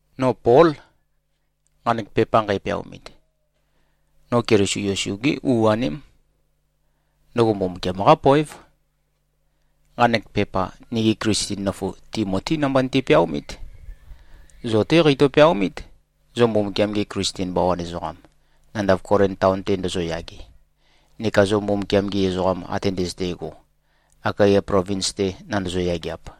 No Pól, nqanek pepa nqæpeaomit. No Keliso Yesu-gé u-aném. Ndøgo Mbumbukiam-qá poév. Nqanek pepa nigi Klisten nøfu Timotí namba niti-peaomít. Zo-té qeitø-peaomít, zo Mbumbukiam-gi Klisten bawan ezoqam, nandav Kolin taon-te ndozoyage, neka zo Mbumbukiam-gi ezoqa ate ndøzøte꞉go, Akaya plovins-te nandozo-yageap.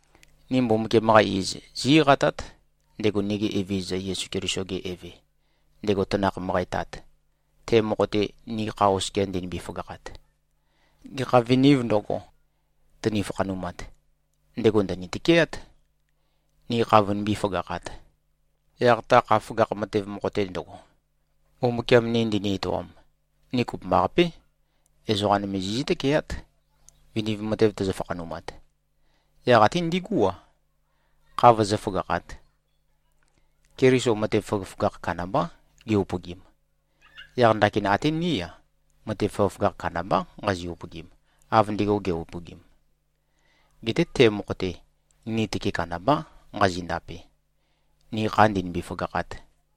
Ni Mbumbukiam-qa iz, zí-eqatát, ndego nigi Evezøza Yesu Keliso-ge Eve, ndego tanakh møqæ Tat, te mokho-te ni kha oskia ndinimbi-føgakhat. Gekha vinīv ndøgo, tøni-fakhanumat, ndego ndø̀ni-tøkeát, ni kha vønimbí-føgakhāt. Yaq ta kha føgakh matev mokho-te ndøgo, Mbumbukiam ni ndini-etoam, ni kopømbaqapé, ezoqa nøme zizǿ-tøkeát, viniv matev tøzø-fakhanumat, yaq até ndigú-a, kha vøzǿ-føgakhāt. Keliso matev føgøføgakh kandambá ge-upøgim. Yaq ndakin até ní-a, matev føgøføgakh kandambá nqazi-upøgim, av ndego ge꞉-upøgim. Geté te mokho-te, ni tøke kandambá nqazi-ndape, ni kha ndīnīmbī-fø̄gākhāt.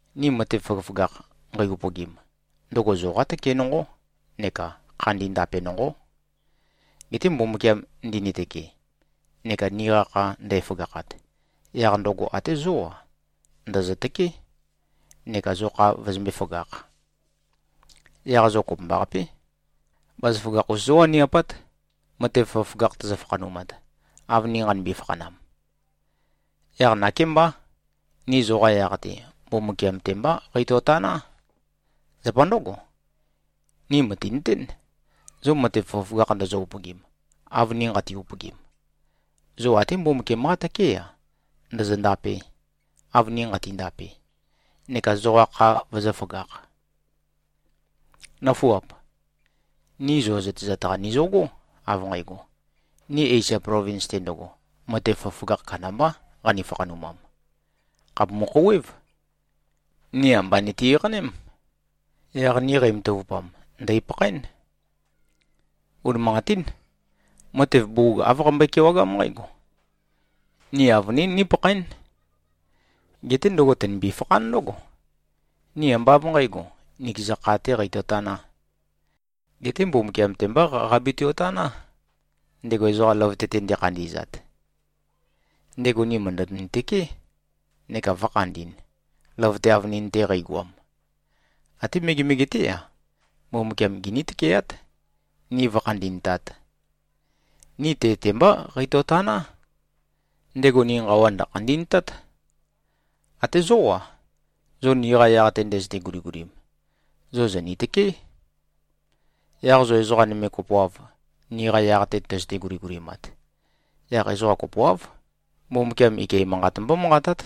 Ni matev føgøføgakh nqei-upøgim, ndøgo zoqá tøke nonqó neka khandi ndape nonqó. Geté Mbumbukiam ndinitøke, neka niqa kha ndæføgakhat, yaq ndøgo até zó-a, ndø̀zøtøké, neka zo kha vøzømbé-føgākh. Yaq zo kopømbaqapé, bazaføgakh-us zówaniapát, matev føgøføgakh tøzø-fakhanumat, av ni nqanimbi-fakhanam. Yaq nakémbá, ni zoqa yaq-te, Mbumbukiam-te mbá qeitøtaná. Zapa ndǿgo, ni mø̀tinøtén, zo matev føgøføgakh ndozo-upøgim, av ni nqati-upøgim, zo até Mbumbukiam-qá tøké-a, ndōzō-ndāpē, av ni nqati-ndape, neka zoqa kha vøzǿføgakh. Nǿfuap. Ni zo zøtezat-qa nizøgó, av nqægo: Ni Esia plovins-te ndøgo, matev føgøføgakh kandambá qani-fakhanumam. Khàpumu-khouwév. Ni amba niti-eqaném. Yaq ni qeimatavupam, ndèipakhaén. Unimanqatín. Matev bugug āv qambøe-kewagám nqǽgo: Ni avønīn nīpakhaēn. Geté ndøgo tø̀nimbi-fakhán ndǿgo: Ni ambá av nqǣgo, nikeza kha-tē qeitōtanā, geté Mbumbukiam-te mbá qabatio-taná, ndego ezoqa løvøte-te ndekhandi꞉zat. Ndego ni mø̀ndøni-tøké neka vø̄khandi꞉n, løvøte avønin-te qeigoam. Até megemege-té-a, Mbumbukiam giní-tøkeát, ni vǿkhandi꞉ntāt. Ni te-te mbá qeitøtaná. Ndego ni nqawa ndø̀khandi꞉ntát. Até zó-a, zo niqa yaq-te ndøzøte-guligulim, zo zòni-tøkeé. Yaq zo ezoqa nøme kopoav, niqa yaq-te tøzøte-guligulimat, yaq ezoqa kopoáv, Mbumbukiam ike manqat mbómanqatát,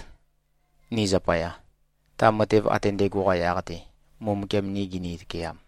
ni zapaya, ta matev ate ndægo-qa yaq-te, Mbumbukiam ni gini-tøkeam.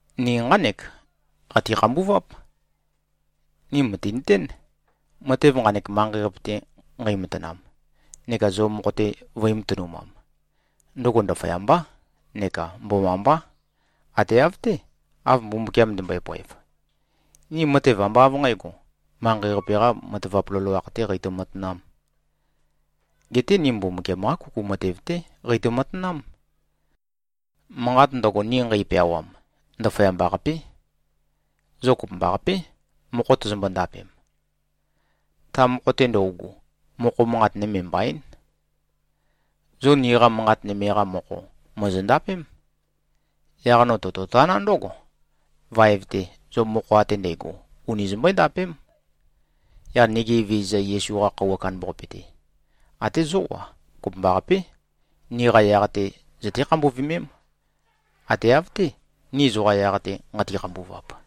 Ni nqánek qati-khambuváp: Ni mø̀tinøtén, matev nqanek manqei-qape-te nqeimatanam, neka zo mokho-te vø̄i-matønumam, ndøgo ndaføyambá neka mbomambá, ate av-té, av Mbumbukiam ndømbøe-poev. Ni matev ambá av nqǣgo, manqei-qape-qā matavap loloakh-tē qeitø-matanām. Geté ni Mbumbukiam-qá kuku matev-té qeitø-matanám. Manqat ndøgo, ni nqeipeawam, ndaføyamba-qapé. Zo kopømbaqapé, mokho tozombo-ndapem. Ta mokho-te ndøugu, mokho manqat nøme mbaín. Zo niqa manqat nøme-qa mokho, mòzondapém. Yaq no tototaná ndǿgo: Vaev-te, zo mokho ate ndægo uni zombøé-ndapém. Yaq nigi Evezøza Yesu-qa Khøuwa Kandambaqape-te, até zó-a, kopømbaqapé, niqa yaq-te zøté-khambuvømém, ate av-té, ni zoqa yaq-te nqati-khambuvap.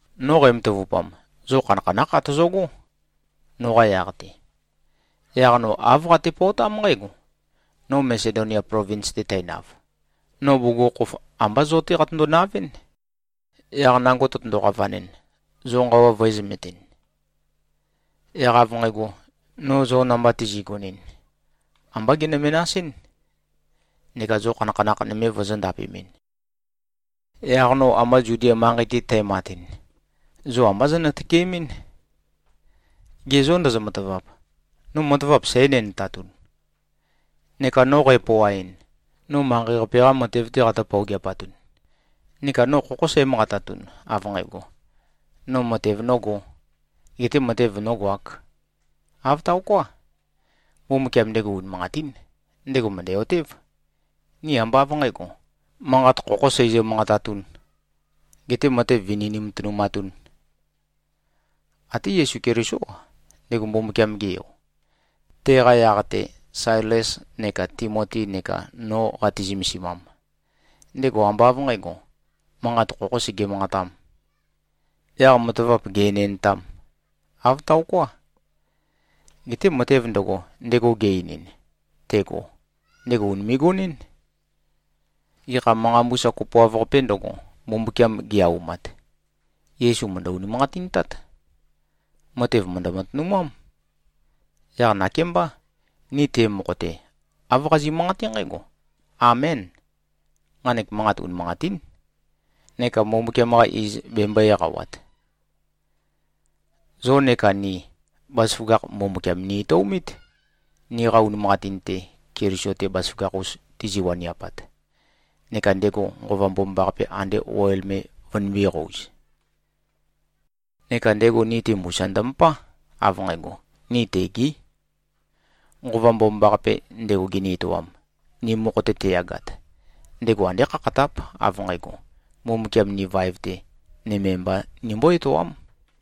No qæmatavupam, zo khanakhanákh atozogó, noqa yaq-te. Yaq no āv qatepøotám nqǽgo: No Masedonia plovins-te tænav, no bugukhokhof, ambá zo-té qatøndo-navɨ́n. Yaq nango tøtøndo-qavanɨn, zo nqawa vø̄ezømetin. Yaq av nqægo, no zo namba tizi꞉gonɨn, ambá genø-menasɨ́n, neka zo khanakhanakh nøme vozō-ndapemɨn. Yaq no amba Zudia manqei-te tæmatɨn, zo ambá zonø-tøkemɨ́n. Ge zô, ndozo-matavap? No matavap sǽ-enendtatun? Neka no qæpøoaɨn, no manqei-qape-qá matev-té qatǿ-pøogeapatun? Neka no khokhó sǽmanqatatun, av nqægo, no matev nōgō, gete matev nōgoāk? Āv taoká. Mbumbukiam, ndego unimanqatín. Ndego mø̀ndæ-otév, ni ambá av nqǣgo, manqat khokhō seizø-manqatatūn, getē matev vini nimatønumatūn. Até Yesu Kelisó-a, ndego Mbumbukiam-ge Yo, teqa yaq-te Sailes neka Timoti neka no qati-zømesimam, ndego ambá av nqǣgo, manqat khokhō sege-manqatām, yaq matavap gè-enendtām. Āv taoká. Geté matev ndøgo, ndego ge-einin, tego, ndego ùnime꞉-gonɨ́n. Gekha manqa mbusa kopoav-qapē ndøgo, Mbumbukiam ge-aumat, Yesu mø̀ndø-unimanqatintát. Matev mø̀ndø-matønumám. Yaq nakémbá, ni te mokho-te, āv qazi꞉-manqaté nqǽgo, “Amén. Nqanek manqat unimanqatín,” neka Mbumbukiam-qa iz bembøē-eqawat. Zo neka ni, bazaføgakh Mbumbukiam ni-etøomít, niqa unimanqatin-te Keliso-te bazaføgakh-us tizi-waniapat, neka ndego Nqova Mbomambaqape ande oil me vønimbō-qouz. Neka ndego ni-te mbusa ndømøpá, av nqægo, ni tegí. Nqova Mbomambaqape, ndego gini-etoam, ni mokho-te teyagat, ndego andé khakhatáp, av nqægo, Mbumbukiam ni vaev-te, nøme mba nimbó-etoám.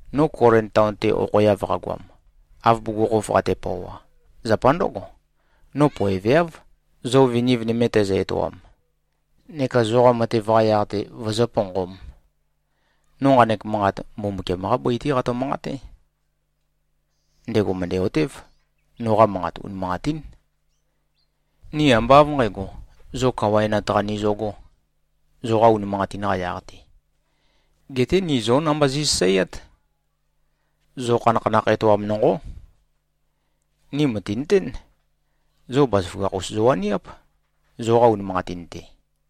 No Kolin taon-te okhoeav qagoam, av bugukhokhof qatepøoa, zapa ndǿgo. No poeveáv, zo viniv nøme tæzø-etoam, neka zoqa matev-qa yaq-te vøzǿ-ponqōm. No nqanek manqat Mbumbukiam-qá bøi-té qato-manqaté. Ndego mø̀ndæ-otév, noqa manqat unimanqatín. Ni ambá av nqǣgo, zo kawaenat-qa nizøgō, zoqa unimanqatin-qa yaq-te. Geté ni zó namba zi꞉sasaeát. Zo khanakhanakh etoam nonqó. Ni mø̀tinøtén, zo bazaføgakh-us zowaniáp, zoqa unimanqatin-te.